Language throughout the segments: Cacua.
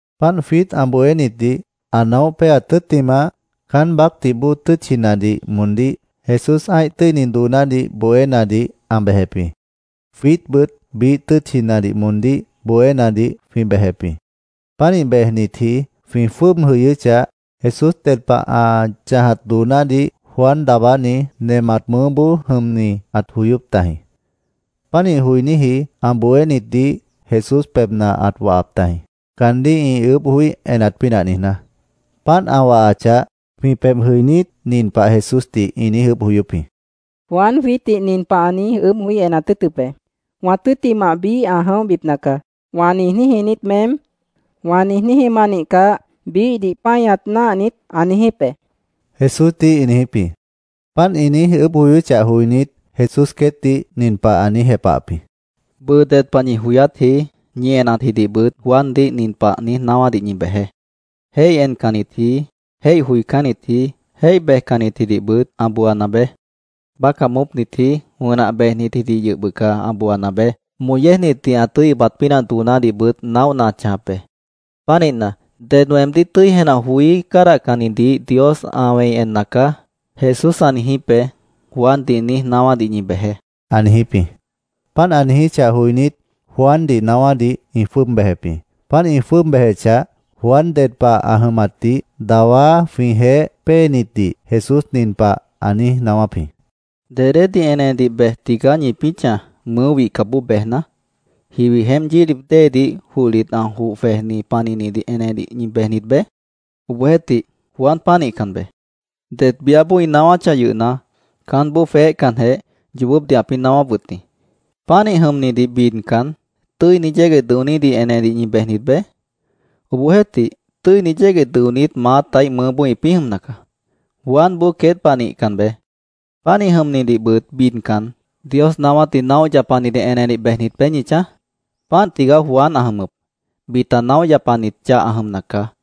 Páant jwiít ã bohénitdih ã naóh péaat tʉ́ttimah, caán baácdih bóo tʉ́tchinadih moondíh Jesús ã́ih tʉ́ini doonádih bohénadih ã bejep jĩ. Jwiítbʉt biíh tʉ́tchinadih moondíh bohénadih jwĩ bejep jĩ. Pánih bejnitji jwĩ jwʉ́ʉb jʉyʉ́chah, Jesús ded pah ã chãjat doonádih Juan Daabáni nemat mʉʉ́boó jʉmni ãt joyóp tajĩ. Pánih joiníji ã bohénitdih Jesús pebhna ãt wahap tajĩ, caandíh ĩ ʉʉ́bh joí enat pínah niijná. Páant ã wahachah, jwĩ pebh jʉinít, nin pah Jesúsdih ĩ niíj ʉʉ́bh joyóp jĩ: —Juan jwiítdih nin pah ã niíj ʉʉ́bh joí enat tʉ́ʉtʉp be: ‘ “Wã tʉ́ttimah biíh ã jʉ̃óhbipna caá”, ¿wã niijníji niít meém? ¿Wã niijníji ma nihcah, biíhdih páñat náah niít?’ ã niijíp be, Jesúsdih ĩ niijíp jĩ. Páant ĩ niíj ʉʉ́bh joyóchah joinít, Jesús queétdih nin pah ã niíj jepahap jĩ: —Bʉʉ ded pah ñi joyátji, ñi enatjidihbʉt Juandih nin pah niíj naáwádih ñi bejeé: ‘Jéih encannitji, jéih joicánnitji, jéih bejcannitjidihbʉt ã booana beé. Bácah moópnitji, wʉnah bejnitjidih yʉh bʉca ã booana beé.Moh yéejnitdih ã tʉ́i ʉbat pínah doonádihbʉt naóhna ã chãjap be. Pánihna, “Ded weemdíh tʉ́i jenah joí cádahcannidih Dios ã wẽi enna caá”, Jesús ã niijíp be’, Juandih niíj naáwádih ñi bejeé, ã niijíp jĩ. Páant ã niijíchah joinít, Juandih naáwádih ĩ jwʉ́ʉb bejep jĩ. Páant ĩ jwʉ́ʉb bejechah, Juan ded pah ã jʉmatdih dawá jwĩjeéh péenitdih Jesús nin pah ã niíj naáwáp jĩ: “¿Dedédih enedih bej tigaá ñipĩ́ chãj, mʉʉ́ wihcapboó bejna? ¿Jiwi jeémp yílip déedih johlit ã joh jwejni panihnidih enedih ñi bejnit beé? Obohjeéhtih, Juan pánihcan beé. Det biáboó ĩ naáwáchah yʉhna, caánboó jweéhcanjeh, yoobópdih ãpĩ́ naáwáp wʉt jĩ. Pánih jʉmnidih bidcan, ¿tʉ́ini yégueh dʉonídih enedih ñi bejnit beé? Obohjeéhtih, tʉ́ini yégueh dʉonít maátaíh mʉʉ́boó ĩpĩ́ jʉmna caá. Juanboó queét pah nihcan beé. Pánih jʉmnidihbʉt bidcan, ¿Dios naáwátdih naóh yapanidih enedih bejnit beé ñi chãj? Páant tigaá Juan ã jʉmʉp. Bita naóh yapanit chah ã jʉmna caá.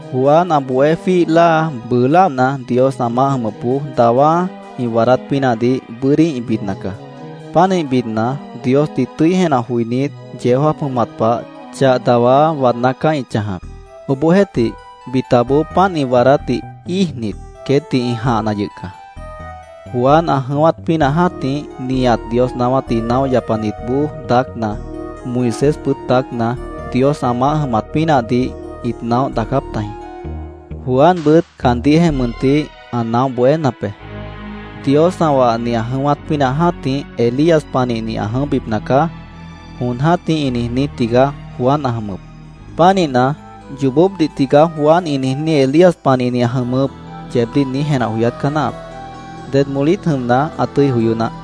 “Juan ã bohé jwíih láa bʉʉ láana, Dios ã maáh jʉmʉpboó dawá ĩ waadát pínahdih bʉ́dí ĩ bidna caá. Pánih bidna, Diosdih tʉ́i jenah joinít, yeó jáap jʉmat pah chah dawá waadná caá ĩ chãjap. Obohjeéhtih, bitaboó páant ĩ waadátdih íijnit, queétdih ĩ jãhna yʉh caá. Juan ã jʉ̃ʉ́wát pínah jã́tih, nihat Dios naáwátdih naóh yapanitboó daácna, Moisésbʉt daácna, Dios ã maáh jʉmat pínahdih ĩt naóh daacáp tajĩ. Juanbʉt caandíhjeh mʉntih ã naóh bohénap be. ‘Dios ã wahni ã jʉ̃ʉ́wát pínah jã́tih, Elías panihni ã jʉ̃óhbipna caá’, jon jã́tih ĩ niijní tigaá Juan ã jʉmʉp. Pánihna, ‘Yoobópdih tigaá Juan ĩ niijní Elías panihni ã jʉmʉp’, yeebdíh niíj jenah joyát caá náahap. ¡Ded molít jʉmna, ã tʉ́i joyó naáh!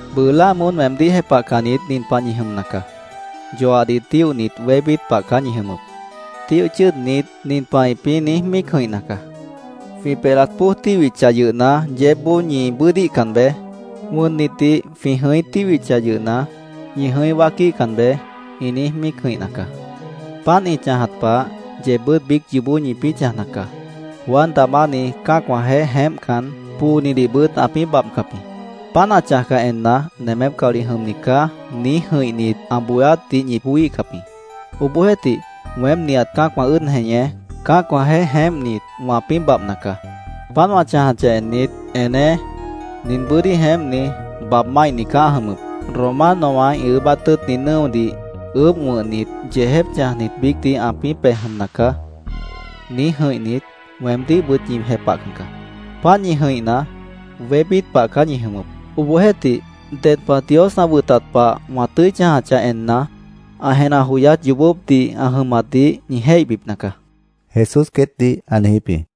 “Bʉʉ láa moón weemdíh jepahcannit nin pah ñi jʉmna caá: Yoahdih tíohnit wébít pah caá ñi jʉmʉp. Tíoh chʉ́ʉdnit, nin pah ĩpĩ́ niíj míic jʉ̃ihna caá: ‘Jwĩ pelat póoj tíhwichah yʉhna, yeébboó ñi bʉ́ʉdíhcan beé. Wʉnnitdih jwĩ jʉ̃í tíhwichah yʉhna, ñi jʉ̃í wáaquíhcan beé’, ĩ niíj míic jʉ̃ihna caá. Páant ĩ chãjat pah, yeebbʉ́t biíc yoobó ñipĩ́ chãjna caá. Juan Daabáni cã́acwãjeéh jeémpcan, poonidihbʉt ãpĩ́ babhcap jĩ. Páant ã chãjcah enna, ‘Nemép caolih jʉmni caá’, niíj jʉ̃ihnit, ã bohéátdih ñi joííhcap jĩ. Obohjeéhtih, weém, nihat cã́acwã ʉ́ʉd jeñé, cã́acwãjeéh jeémpnit, wãpĩ́ babhna caá. Páant wã chãjachah ennit, ‘Eneé. Nin bʉ́dí jeémpni, babh máihni caá ã jʉmʉp. Romanowã ĩ ʉʉ́bát tʉ́ʉtni nʉ́odih ʉʉ́bh wʉ̃hnit, yeejép chãjnit biícdih ãpĩ́ pej jʉmna caá’, niíj jʉ̃ihnit, weemdíhbʉt ñi jepahcan caá. Páant niíj jʉ̃ihna, wébít pah caá ñi jʉmʉp. Obohjeéhtih, ded pah Dios ã wʉtat pah wã tʉ́i chãjachah enna, ã jenah joyát yoobópdih ã jʉmatdih ñi jéihbipna caá”, Jesús queétdih ã niijíp jĩ.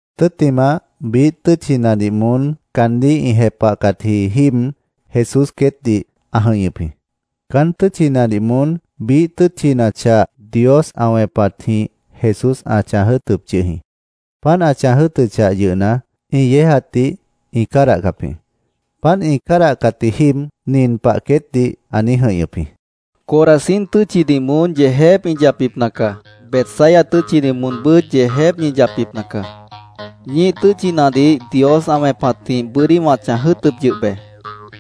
Tʉ́ttimah, biíh tʉ́tchinadih moón caandíh ĩ jepahcatji jíib, Jesús queétdih ã jʉ̃ihñʉp jĩ. Caán tʉ́tchinadih moón biíh tʉ́tchina chah Dios ã wẽpatjĩh Jesús ã chãj jʉ́ʉtʉp yʉh jĩ. Páant ã chãj jʉ́ʉtʉchah yʉhna, ĩ yéejatdih ĩ cádahcap jĩ. Páant ĩ cádahcatji jíib nin pah queétdih ã niíj jʉ̃ihñʉp jĩ: “¡Corazín tʉ́tchidih moón yeejép ñi yapbipna caá! ¡Betsaida tʉ́tchidih moonbʉ́t yeejép ñi yapbipna caá! Ñíih tʉ́tchinadih Dios ã wẽpatjĩh bʉ́dí wã chãj jʉ́ʉtʉp yʉh be.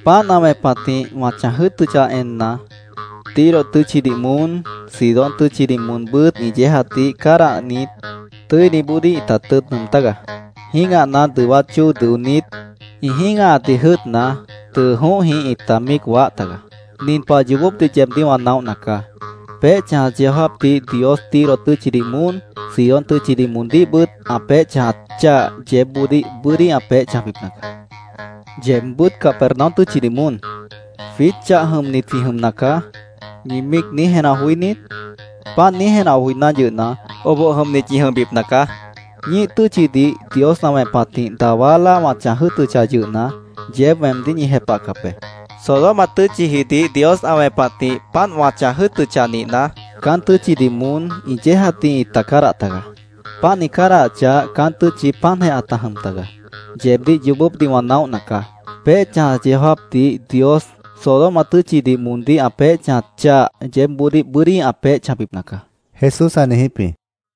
Páant ã wẽpatjĩh wã chãj jʉ́ʉtʉchah enna, Tiro tʉ́tchidih moón, Sidón tʉ́tchidih moonbʉ́t ĩ yéejatdih cádahnit, tʉ́iniboodíh ĩta tʉ́ʉt nʉʉm tágaá. Jĩ́gahna dʉwát chóo dʉonít, ĩ jĩ́gahatdih jʉ́ʉtna, tʉʉ jõóhjĩh ĩta míic waáh tagaá. Nin pah yoobópdih yeebdíh wã naóhna caá: Peéh chãjat yeó jáapdih Dios Tiro tʉ́tchidih moón, Sidón tʉ́tchidih moondíhbʉt ã peéh chãjat chah yeébboodíh bʉ́dí ã peéh chãjbipna caá. Yeebbʉ́t Capernaum tʉ́tchidih moón, ‘Jwiít chah jʉmnit jwĩ jʉmna caá’, ¿ñi míic niíj jenah joí niít? Páant niíj jenah joiná yʉhna, oboh jʉmnit ñi jʉmbipna caá.Ñíih tʉ́tchidih Dios ã wẽpatjĩh dawá láa wã chãj jʉ́ʉtʉchah yʉhna, yeéb weemdíh ñi jepahcap be. Sodoma tʉ́tchijidih Dios ã wẽpatjĩh páant wã chãj jʉ́ʉtʉchah nihna, caán tʉ́tchidih moón ĩ yéejatdih ĩta cádah tagaá. Páant ĩ cádahachah, caán tʉ́tchi páantjeh ãta jʉm tagaá. Yeebdíh yoobópdih wã naóhna caá. Peéh chãjat yeó jáapdih Dios Sodoma tʉ́tchidih moondíh ã peéh chãjat chah yeébboodíh bʉ́dí ã peéh chãjbipna caá”, Jesús ã niijíp jĩ.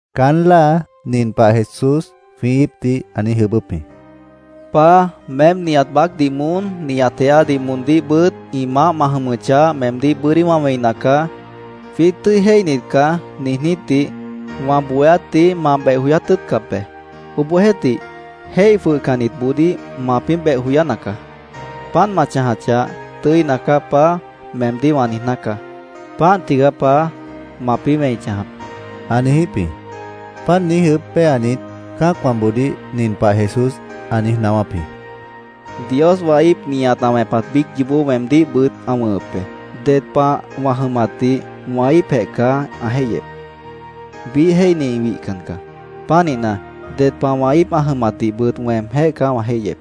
Caán láa nin pah Jesús jwĩ íipdih ã niíj ʉʉ́bʉ́p jĩ: “Paá, meém nihat baácdih moón, nihat jeádih moondíhbʉt ĩ maáh ma jʉmʉchah, meemdíh bʉ́dí wã wẽina caá. ‘Jwiít tʉ́i jéihnit caá’, niijnítdih wã bohéátdih ma beh joyát tʉ́ʉtcap be. Obohjeéhtih, jéih jwʉhcannitboodíh mapĩ́ beh joyána caá. Páant ma chãjachah, ‘Tʉ́ina caá, Paá’, meemdíh wã niijná caá. Páant tigaá, Paá, mapĩ́ wẽi chãjap”, ã niijíp jĩ. Páant niíj ʉʉ́bh péanit, cã́acwãboodíh nin pah Jesús ã niíj naáwáp jĩ: “Dios wã íip nihat ã wẽpat biíc yoobó weemdíhbʉt ã wʉ̃hʉp be.Ded pah wã jʉmatdih wã íipjeh caá ã jéihyep. Biíh jéihni wihcan caá. Pánihna, ded pah wã íip ã jʉmatdihbʉt weemjéh caá wã jéihyep.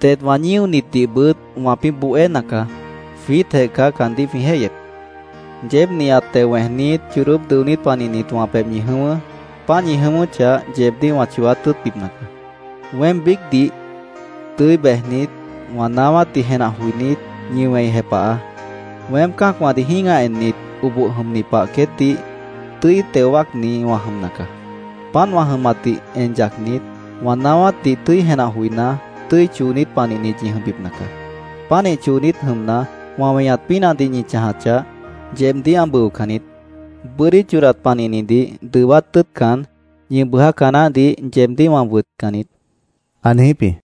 Det wã ñíonitdihbʉt wãpĩ́ bohéna caá. Jwiítjeh caá caandíh jwĩ jéihyep. Yeéb nihat teo wẽejnít, chodóp dʉonít panihnit wã pebh ñi jʉ̃ʉ́wʉ́. Páant ñi jʉ̃ʉ́wʉ́chah, yeebdíh wã chooát tʉ́ʉtbipna caá. Weém biícdih tʉ́i bejnit, wã naáwátdih jenah joinít, ñi wẽi jepahaá. Weém cã́acwãdih jĩ́gah ennit, oboh jʉmni pah queétdih tʉ́i teo wáacni wã jʉmna caá. Páant wã jʉmatdih en yacnit, wã naáwátdih tʉ́i jenah joiná, tʉ́i choonít panihnit ñi jʉmbipna caá. Pánih choonít jʉmna, wã weñat pínahdih ñi chãjachah, yeebdíh ã bʉocan niít. Bʉ́dí chodat panihnidih dʉwát tʉ́ʉtcan, ñi bʉʉjáca naáhdih yeebdíh wã wʉtcan niít”, ã niijíp jĩ.